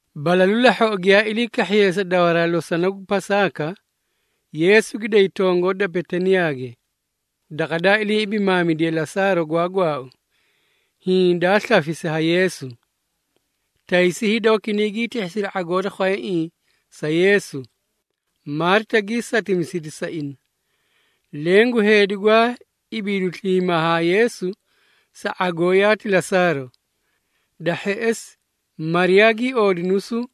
Balalu lahhoꞌo giyaa ilii kahhiyee sa dawaraa losona gu Pasaaka, Yeesu gi day tongoo da Betaniyaage, daqa daa ilii ibimaamidiye Lasaaro gwaa gwaau, hiĩ daa slafisi ha Yeesu. Taysi hida wakinay gii tihhisiri ⁄agoo da khwayaiĩ sa Yeesu, Maarita gii satimisidi sa ina. Leẽ gu heedi gwaa ibiidu sliimaa haa Yeesu sa ⁄agoo yaati Lasaaro. Da hheꞌesi, Mariyaa gii oodi nusuu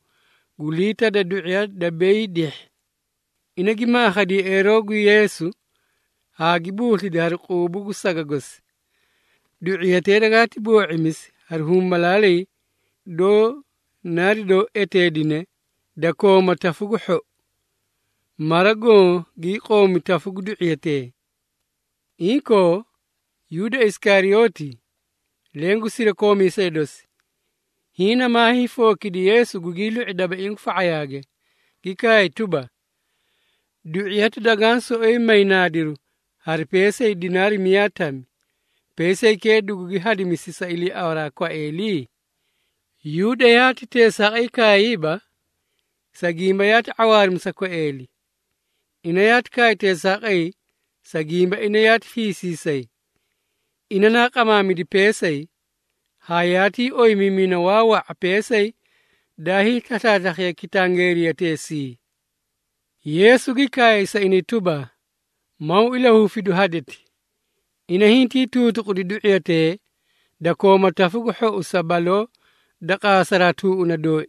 gu liita da du⁄iya da beyii dihhi. Ina gi maakhadi yeꞌeeroo gu Yeesu haa gi buuslidi hari quubu gu saga gosi. Du⁄iyatee dagaati boo⁄imisi hari humbalaalay doó narido eteedine da kooma tafu gu hhou. Mara goõ gii qoomi tafu gu du⁄iyatee. Inkoo, Yuuda Isikariyooti, leẽ gu sirakoomiisee dosi, hiĩ namaa hiifookidi Yeesu gugii lu⁄i dabaiĩ gu fa⁄ayaage, gi kaay tuba, “Du⁄iyati dagaã soꞌoyi may naadiru hari peesay dinaari miyaa tami, peesaykee dugugi hadimisi sa iliiawaraa kwaeeli?” Yuuda yaati teesaaqay kaayiiba, sa gimba yaati ⁄awaarimi sa kwaeeli. Ina yaati kaay teesaaqay, sa gimba ina yaati fiisiisay. Ina naa qamaamidi peesay, haa yaatii oyimiimina waa wa⁄a peesay daa hiislaslaaslakhiye kitangeeriyateesii. Yeesu gi kaay sa inay tuba, “Maw ilahufidu hadeti. Ina hintii tuutuqudi du⁄iyatee da kooma tafu gu hhou sa baloo da qaasaraa tuuꞌuna dooi.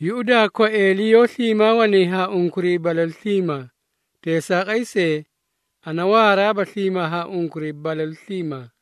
Yuꞌudaa, kwaeeli yoó sliimaa wanay haa unkuray balalu sliimaa. Teesaaqay see, ana waaraaba sliimaa haa unkuray balalu sliimaa.”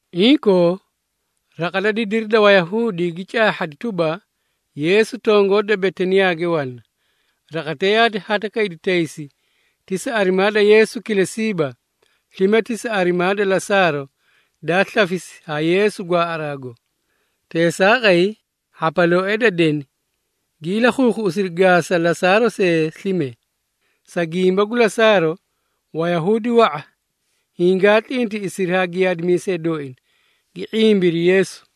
Inkoo, raqa da didiri da Wayahuudi gi caahhadi tuba, Yeesu tongoo da Betaniyaage wana. Raqatee yaati hadakaydi taysi, ti sa arimaa da Yeesu kilesiiba, slime ti sa arimaa da Lasaaro, daa slafisi ha Yeesu gwaaꞌaraago. Teesaaqay, hhapalooee da deni gi ilakhuukhuꞌusiri gaasa Lasaaro see slime. Sa gimba gu Lasaaro, Wayahuudi wa⁄a hingaa tlintiꞌisidi haa giyaadimiisee dooina, gi ⁄imbiri Yeesu.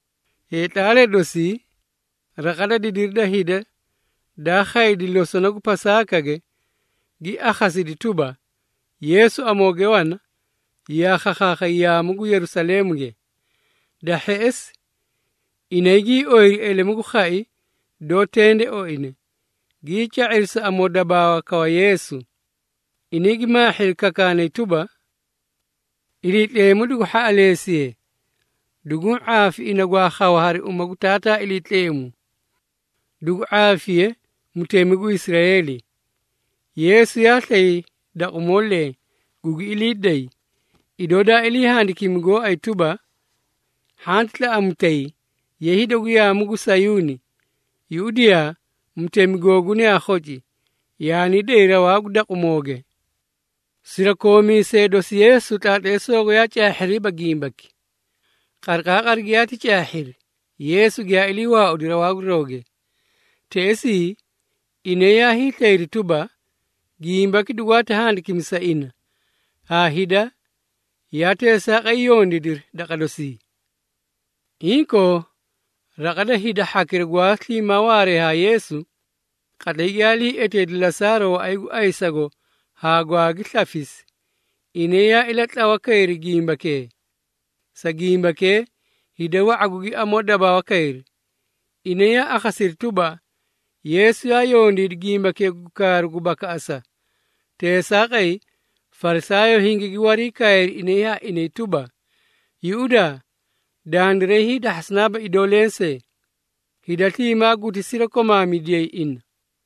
Heetlaalee dosi, raqa da didiri da hida daa khaydi losona gu Pasaakage, gi akhasidi tuba, Yeesu amooge wana, yaa khakhaakhay yaamu gu Yerusaleemuge. Da hheꞌesi, inay gii oyiri elemu gu khai doó tende oine, gii ca⁄iri sa amoodabaawa kawa Yeesu. Inay gi maahhiri kakaanay tuba, “Iliitleemu dugu hhaꞌaleesiye! Duguũ ⁄aafi ina gwaa khawa hari uma gu Taataa Iliitleemu! Dugu ⁄aafiye, Mutemi gu Israeeli!” Yeesu yaa slay daqumoo leẽ, gugi ilii day, idoo daa ilii handikimi gooay tuba, “Hhanti tlaꞌamutay, ye hida gu yaamu gu Sayuuni. Yuꞌudiyaa! Mutemi googuna yaa khoci, yaanii day rawaa gu daqumooge!” Sirakoomiisee dosi Yeesu tlaatleesoogo yaa caahhiriiba gimbaki. Qariqaaqari giyaati caahhiri, Yeesu giyaa ilii waaudi rawaa gu rawge. Teꞌesii, inay yaa hiislayri tuba, gimbaki dugwaati handikimi sa ina, haa hida yaa teesaaqay yondiidiri daqa dosii. Inkoo, raqa da hida hhakira gwaa sliimaa waaree haa Yeesu, qatlay giyaa ilii eteedi Lasaaro waꞌay gu ayisago haa gwaagi slafisi, inay yaa ilatlawa kayri gimbakee. Sa gimbakee, hida wa⁄a gugi amoo dabaawakayri. Inay yaa akhasiri tuba, Yeesu yaa yondiidi gimbakee gu kaaru gu bakaꞌasa. Teesaaqay, Farisaayoo hingigi wariikaayri inay haa inay tuba, “Yuꞌudaa! Dandiray hiidahhasanaaba idoo lensee. Hida sliimaa guti sirakomaamidiyay Ina!”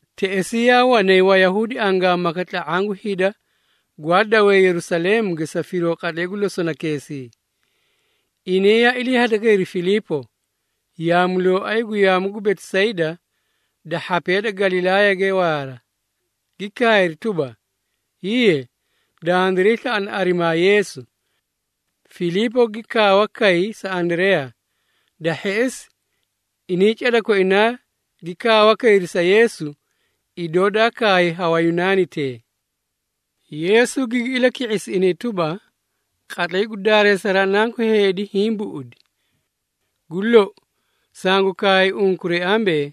Teꞌesii yaa wanay Wayunaani angaamaka tla⁄aã gu hida gwaa dawee Yerusaleemuge sa firoo qatlay gu losonakeesii. Inay yaa ilii hadakayri Filiipo, yaamulooay gu yaamu gu Betisayda da hhapee da Galilaayage waara, gi kaayri tuba, “Hiiye, dandiray slaꞌana arimaa Yeesu.” Filiipo gi kaawa kay sa Andareyaa. Da hheꞌesi, inay cada koinaa gi kaawa kayri sa Yeesu idoo daa kaay ha Wayunaanitee. Yeesu gigi ilaki⁄isi inay tuba, “Qatlay gu daareesaraa Nanku Heedi hiĩ buꞌudi. Gu lou, sangu kaay unkuray ambee,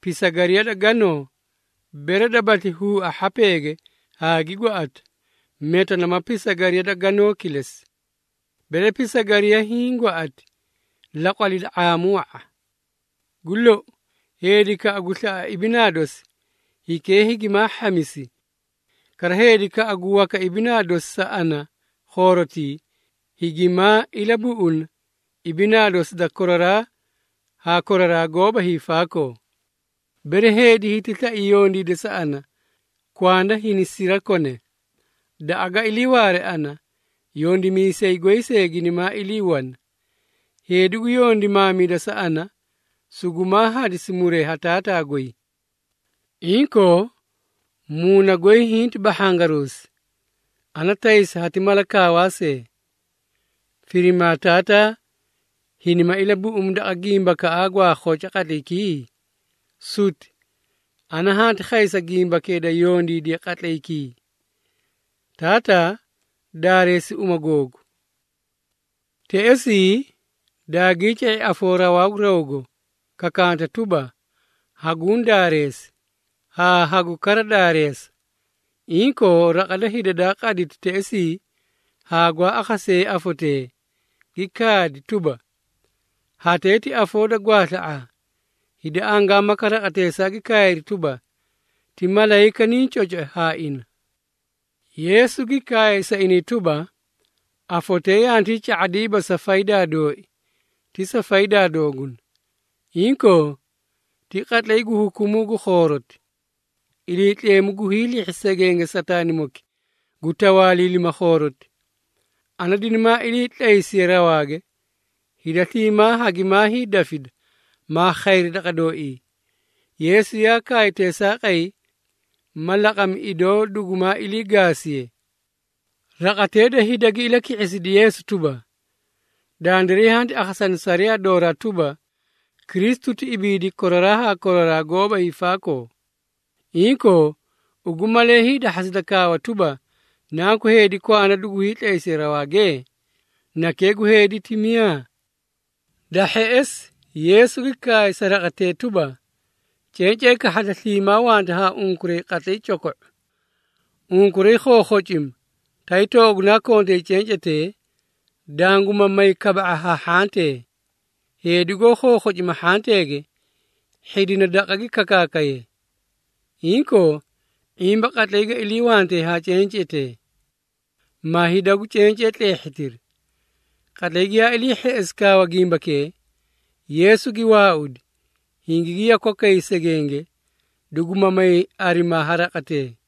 pisagariya da ganoo, bere dabasli huua hhapeege haa gi gwaꞌata, meta nama pisagariya da ganoo kilesi. Bere pisagariya hiĩ gwaꞌati laqwalida ⁄aamu wa⁄a. Gu lou, heedikaꞌa gu slaꞌa ibinaa dosi, hikee higimaa hhamisi. Kara, heedikaꞌa gu waka ibinaa dosi sa ana khoorotii, higimaa ilabuꞌuna ibinaa dosi da koraraa haa koraraa goóba hiifaakoo. Bere heedi hiti slai yondiida sa ana, kwanda hini sirakone. Daqa ga iliiwaare ana, yondimiisay goy see ginimaa ilii wana. Heedi gu yondimaamida sa ana, sugumaa hadisi muree ha Taataa goy. Inkoo, muuna goy hinti bahhangaruusi. Ana taysa hati mala kaawaa see. Firima Taataa, hinima ilabuꞌumi daqa gimbakaꞌa gwaa khoca qatlaykii? Suti! Ana hanti khay sa gimbakee da yondiidiye qatlaykii. Taataa, daareesi uma googu!” Teꞌesii, daagii ca⁄i afoo rawaa gu rawgo, kakanta tuba, “Haguũ daareesi, haa hagu kara daareesa.” Inkoo, raqa da hida daa qaditi teꞌesii haa gwaa akhasee afotee, gi kaadi tuba, “Hatee ti afoo da gwaasla⁄aa!” Hida angaamaka raqateesaa gi kaayri tuba, “Ti malayika niĩ cocaacoi haa ina!” Yeesu gi kaay sa inay tuba, “Afotee yantii ca⁄adiiba sa faydaa dooi, ti sa faydaa dooguna. Inkoo, ti qatlay gu hukumuu gu khooroti. Iliitleemu gu hiilihhi segenge Sataanimoki gu tawaaliilima khooroti. Ana dinimaa ilii tlaysiye rawaage, hida sliimaa hagimaa hiidafida, maa khayri daqa dooii.” Yeesu yaa kaay teesaaqay, ma laqami, idoo dugumaa ilii gaasiye. Raqatee da hida gi ilaki⁄isidi Yeesu tuba, “Dandiray hanti akhasani sariyaa dooraa tuba, Kristu ti ibiidi koraraa haa koraraa goóba hiifaakoo. Inkoo, ugu malee hiidahhasida kaawa tuba, Nanku Heedi kwanda dugu hiitlaysiye rawaage? ‘Nakee gu Heedi’ ti miyaa?” Da hheꞌesi, Yeesu gi kaay sa raqatee tuba, “Cencee kahhada sliimaa wanta haa unkuray qatlay coko⁄u. Unkuray khookhocima, tay toogunaa kontay cencetee, danguma may kaba⁄a ha hhantee. Heedi goó khookhocima hhanteege, hhidina daqa gi kakaakaye. Inkoo, ⁄imba qatlay ga iliiwante haa cencetee, ma hida gu cencee tleehhitiri.” Qatlay giyaa ilii hheꞌesi kaawa gimbakee, Yeesu gi waaudi, hingigi yakwakay segenge, duguma may arimaa ha raqatee.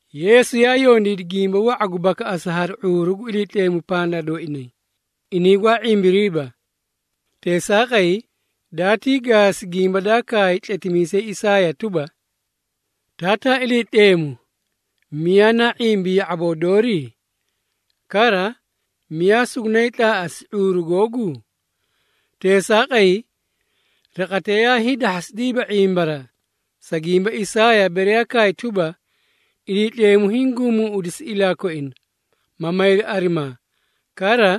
Yeesu yaa yondiidi gimba wa⁄a gu bakaꞌasa hari ⁄uuru gu Iliitleemu pandaa dooinay, inay gwaa ⁄imbiriiba. Teesaaqay, daatii gaasi gimba daa kaay tletimiisay Isaaya tuba, “Taataa Iliitleemu, miyaa naa ⁄imbi ya⁄aboo doori? Kara, miyaa sugunaay tlaaꞌasi ⁄uuru googu?” Teesaaqay, raqatee yaa hiidahhasidiiba ⁄imbaraa, sa gimba Isaaya bere kaay tuba, “Iliitleemu hiĩ guumuuꞌudisi ilaa koina, ma mayri arimaa, kara,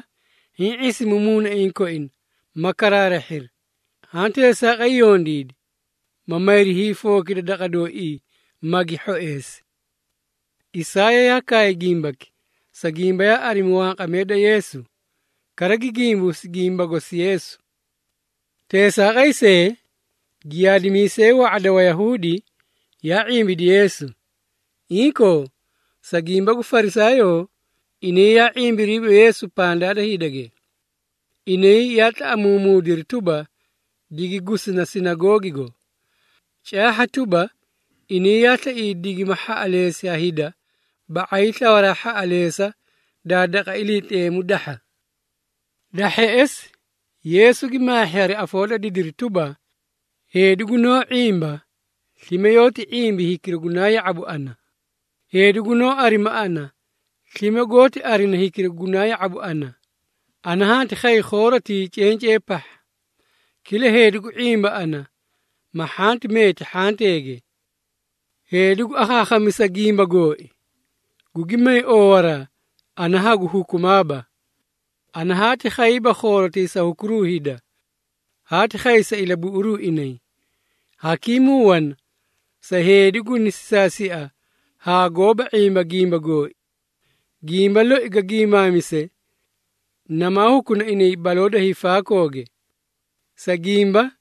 hiĩ ⁄isimi muunaiĩ koina, ma karaarahhiri. Haã teesaaqay yondiidi, ma mayri hiifookida daqa dooii, magi hhoeesi.” Isaaya yaa kaay gimbaki, sa gimba yaa arimi wanqamee da Yeesu, kara gi gimbuusi gimba gosi Yeesu. Teesaaqay see, giyaadimiisee wa⁄a da Wayahuudi yaa ⁄imbidi Yeesu. Inkoo, sa gimba gu Farisaayoo, inay yaa ⁄imbiriiba Yeesu pandaa da hidage. Inay yaa tlaꞌamuumuudiri tuba, digi gusina sinagoogigo. Caahha tuba, inay yaa slaiyay digima hhaꞌaleesi ha hida ba⁄ay da slawaraa hhaꞌaleesa da daqa Iliitleemu dahha. Da hheꞌesi, Yeesu gi maahhi hari afoo da didiri tuba, “Heedi gunoó ⁄imba, slime yoóti ⁄imbi hikira gunaa ya⁄abu ana. Heedi gunoó arima ana, slime goóti arina hikira gunaa ya⁄abu ana. Ana hanti khay khoorotii cencee pahha, kila heedi gu ⁄imba ana, ma hhanti meeti hhanteege. Heedi gu akhaakhamisa gimba gooi, gugi may oowaraa, ana hagu hukumaaba. Ana haati khayiiba khoorotii sa hukuruu hida, haati khay sa ilabuꞌuru inay. Hakimuu wana sa heedi guni sisaasia haa gooba ⁄imba gimba gooi. Gimba loi ga gimaamise, namaa hukuna ina baloo da hiifaakooge. Sa gimba,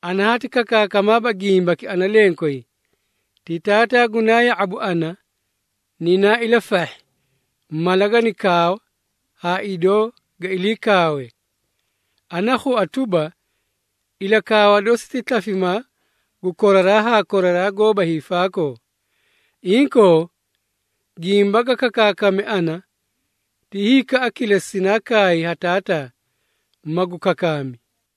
ana haati kakaakamaaba gimbaki ana lenkway, ti Taataa gunaa ya⁄abu ana, ninaa ilafahhi, mala gani kaawa haa idoo ga ilii kaawe. Ana khua tuba, ilakaawa dosi ti slafimaa gu koraraa haa koraraa goóba hiifaakoo. Inkoo, gimba ga kakaakame ana, ti hikaꞌa kilesi sinaa kaay ha Taataa, magu kakaami.”